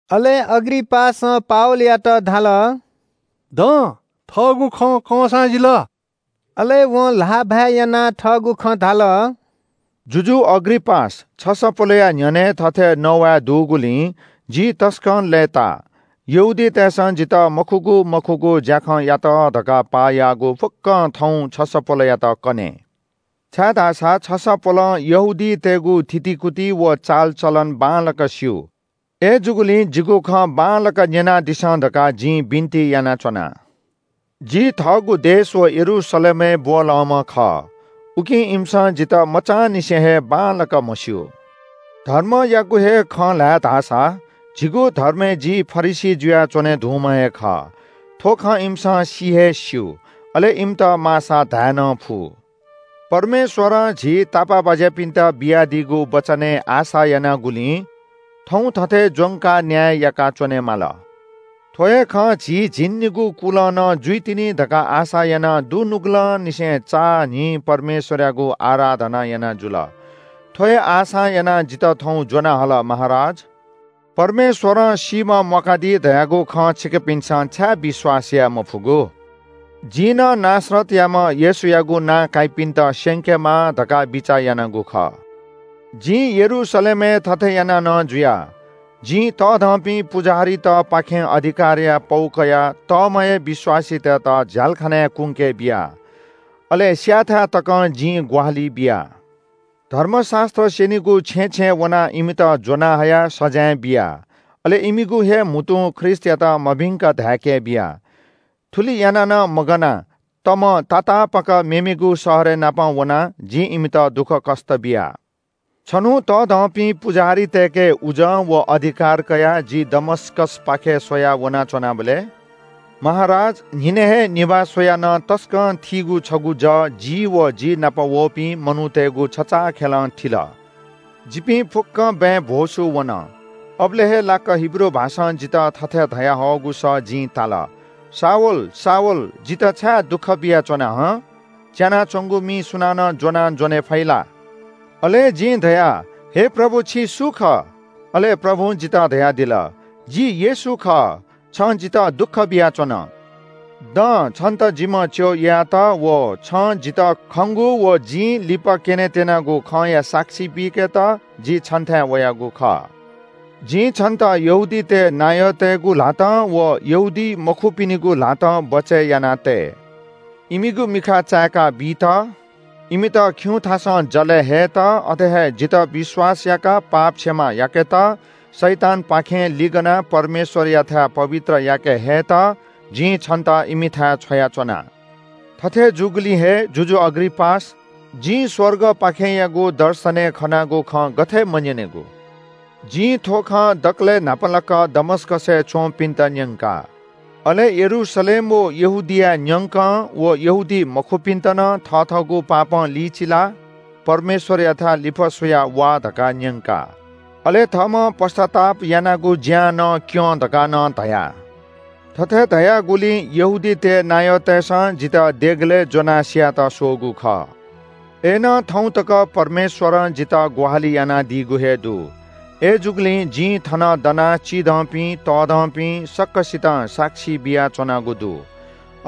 अले अग्रिपासं पावलयात धाल – “दँ, थःगु खँ कंसां जिल।” अले वं ल्‍हाःभाय् यानाः थःगु खँ धाल – “जुजु अग्रिपास, छसपोलया न्‍ह्यःने थथे नवाये दुगुलिं जि तसकं लय्‌ता। यहूदीतय्‌सं जितः मखुगु मखुगु ज्‍याखँयात धकाः पाः याःगु फुक्‍कं थौं छसपोलयात कने, छाय्‌धाःसा छसपोलं यहूदीतय्‌गु थितिकुति व चालचलन बांलाक स्‍यू। अय्‌जूगुलिं जिगु खँ बांलाक न्‍यनादिसँ धकाः जिं बिन्‍ति यानाच्‍वना।” “जि थःगु देश व यरूशलेमय् ब्‍वलंम्‍ह खः। उकिं इमिसं जितः मचांनिसें हे बांलाक म्‍हस्‍यू। धर्मयागु हे खँ ल्‍हाये धाःसा झीगु धर्मय् जि फरिसी जुयाच्‍वने धुंम्‍ह हे खः। थ्‍व खँ इमिसं सि हे स्‍यू, अले इमित माःसा धाये नं फु। परमेश्‍वरं झी तापाःबाज्‍यापिन्‍त बियादीगु वचनय् आशा यानागुलिं थौं थथे ज्‍वंकाः न्‍याय याका च्‍वनेमाल। थ्‍व हे खँ झी झिंनिगू कुलं नं जुइतिनि धकाः आशा यानाः दुनुगलंनिसें चां न्‍हिं परमेश्‍वरयागु आराधना याना जुल। थ्‍व हे आशां यानाः जितः थौं ज्‍वना हल, महाराज। परमेश्‍वरं सीम्‍ह म्‍वाकादी धयागु खँ छिकपिन्‍सं छाय् विश्‍वास याये मफुगु?” “जिं नं नासरतयाम्‍ह येशूयागु नां काइपिन्‍त स्‍यंकेमाः धकाः बिचाः यानागु खः। जिं यरूशलेमय् थथे याना नं जुया। जिं तःधंपिं पुजाहारीतपाखें अधिकारया पौ कयाः तःम्‍ह हे विश्‍वासीतय्‌त झ्‍यालखानाय् कुंके बिया। अले स्‍यायेथाय् तकं जिं ग्‍वाहालि बिया। धर्मशास्‍त्र स्‍यनिगु छेँय् छेँय् वनाः इमित ज्‍वनाहयाः सजाँय बिया, अले इमिगु हे म्‍हुतुं ख्रीष्‍टयात मभिंक धाय्‌के बिया। थुलि याना नं मगानाः तमं तातापाक मेमेगु शहरय् नापं वनाः जिं इमित दुःखकष्‍ट बिया।” “छन्‍हु तःधंपिं पुजाहारीतय्‌के उजं व अधिकार कयाः जि दमस्‍कसपाखे स्‍वयाः वनाच्‍वनाबलय् महाराज, न्‍हिनय् हे निभाः स्‍वयाः नं तसकं थीगु छगू जः जि व जि नाप वःपिं मनूतय्‌गु छचाःखेलं थिल। जिपिं फुक्‍कं बँय् भ्‍वसू वन। अबलय् हे लाक्‍क हिब्रू भाषां जितः थथे धयाहःगु सः जिं ताल – ‘शाऊल, शाऊल, जितः छाय् दुःख बियाच्‍वना हं? च्‍यानाच्‍वंगु मि सुनानं ज्‍वनां ज्‍वने फइ ला?’ “अले जिं धया – ‘हे प्रभु, छि सु खः?’ “अले प्रभुं जितः धयादिल – ‘जि येशू खः। छं जितः दुःख बियाच्‍वन। दँ, छन्‍त जिम्‍ह च्‍यः यायेत व छं जितः खंगु व जिं लिपा क्‍यनेत्‍यनागु खँया साक्षी बीकेत जि छन्‍थाय् वयागु खः। जिं छन्‍त यहूदीतय् नायःतय्‌गु ल्‍हातं व यहूदीमखुपिनिगु ल्‍हातं बचय् यानातये। इमिगु मिखा चाय्‌का बीत, इमित खिउँथासं जलय् हयेत, अथे हे जितः विश्‍वास याकाः पाप क्षमा याकेत, शैतानपाखें लिगनाः परमेश्‍वरयाथाय् पवित्र याके हयेत जिं छन्‍त इमिथाय् छ्वयाच्‍वना।’” “थथे जूगुलिं हे, जुजु अग्रिपास, जिं स्‍वर्गपाखेंयागु दर्शनय् खनागु खँ गथे मन्‍यनेगु? जिं थ्‍व खँ दकलय् न्‍हापालाक दमस्‍कसय् च्‍वंपिन्‍त न्‍यंका। अले यरूशलेम व यहूदियाय् न्‍यंकं व यहूदीमखुपिन्‍त नं थथःगु पापं लिचिलाः परमेश्‍वरयाथाय् लिफः स्‍वयाः वा धकाः न्‍यंका। अले थःम्‍हं पश्‍चाताप यानागु ज्‍यां नं क्‍यँ धकाः नं धया। थथे धयागुलिं यहूदीतय् नायःतय्‌सं जितः देगलय् ज्‍वनाः स्‍यायेत स्‍वःगु खः। अय्‌नं थौं तक परमेश्‍वरं जितः ग्‍वाहालि यानादीगु हे दु। अय्‌जूगुलिं जिं थन दनाः चिधंपिं, तःधंपिं, सकसितं साक्षी बियाच्‍वनागु दु।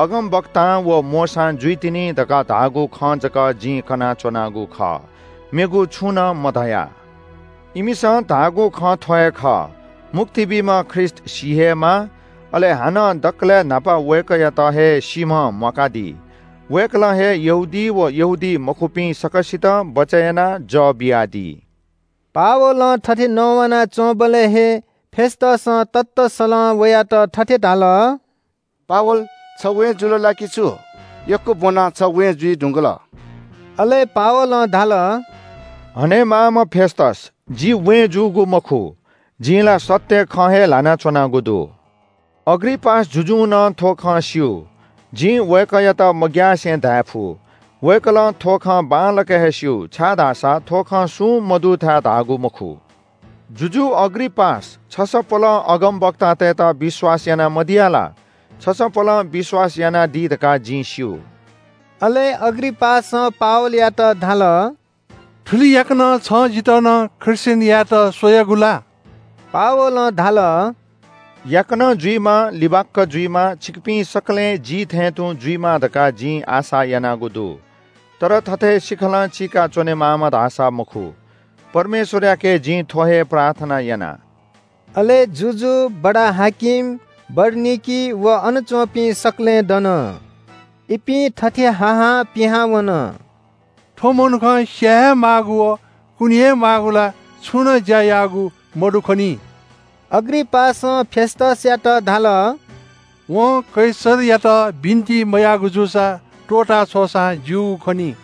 अगमवक्तां व मोशां जुइतिनि धकाः धाःगु खँ जक जिं कनाच्‍वनागु खः, मेगु छुं नं मधया। इमिसं धाःगु खँ थ्‍व हे खः – ‘मुक्ति बीम्‍ह ख्रीष्‍ट सी हे माः, अले हानं दकलय् न्‍हापा वय्‌कःयात हे सीम्‍हं म्‍वाकादी। वय्‌कलं हे यहूदी व यहूदीमखुपिं सकसितं बचय् यानाः जः बियादी।’” पावलं थथे नवानाच्‍वंबलय् हे फेस्‍तसं ततःसलं वयात थथे धाल – “पावल, छ वें जुल ला कि छु? यक्‍व ब्‍वनाः छ वें जुइ धुंकल।” अले पावलं धाल – “हनेमाःम्‍ह फेस्‍तस, जि वें जूगु मखु। जिं ला सत्‍य खँ हे ल्‍हाना च्‍वनागु दु। अग्रिपास जुजुं नं थ्‍व खँ स्‍यू। जिं वय्‌कःयात मग्‍यासे धायेफु। वय्‌कलं थ्‍व खँ बांलाक हे स्‍यू, छाय्‌धाःसा थ्‍व खँ सुं मदुथाय् धाःगु मखु। जुजु अग्रिपास, छसपोलं अगमवक्तातय्‌त विश्‍वास याना मदिया ला? छसपोलं विश्‍वास यानादी धकाः जिं स्‍यू।” अले अग्रिपासं पावलयात धाल – “थुलि याकनं छं जितः नं ख्रीष्‍टियन यायेत स्‍वयागु ला?” पावलं धाल – “याकनं जुइमा, लिबाक्‍क जुइमा, छिकपिं सकलें जि थें तुं जुइमा धकाः जिं आशा यानागु दु। तर थथे सिखलं चीका च्‍वनेमाःम्‍ह धाःसा मखु। परमेश्‍वरयाके जिं थ्‍व हे प्रार्थना याना।” अले जुजु, बडा-हाकिम, बरनिकी व अन च्‍वंपिं सकलें दन। इपिं थथे हा हां पिहां वन – “थ्‍व मनुखं स्‍याये हे माःगु व कुने हे माःगु ला छुं नं ज्‍या याःगु मदु खनी।” अग्रिपासं फेस्‍तसयात धाल – “वं कैसरयात बिन्‍ति मयाःगु जूसा त्‍वःता छ्वःसां ज्‍यूगु खनी।”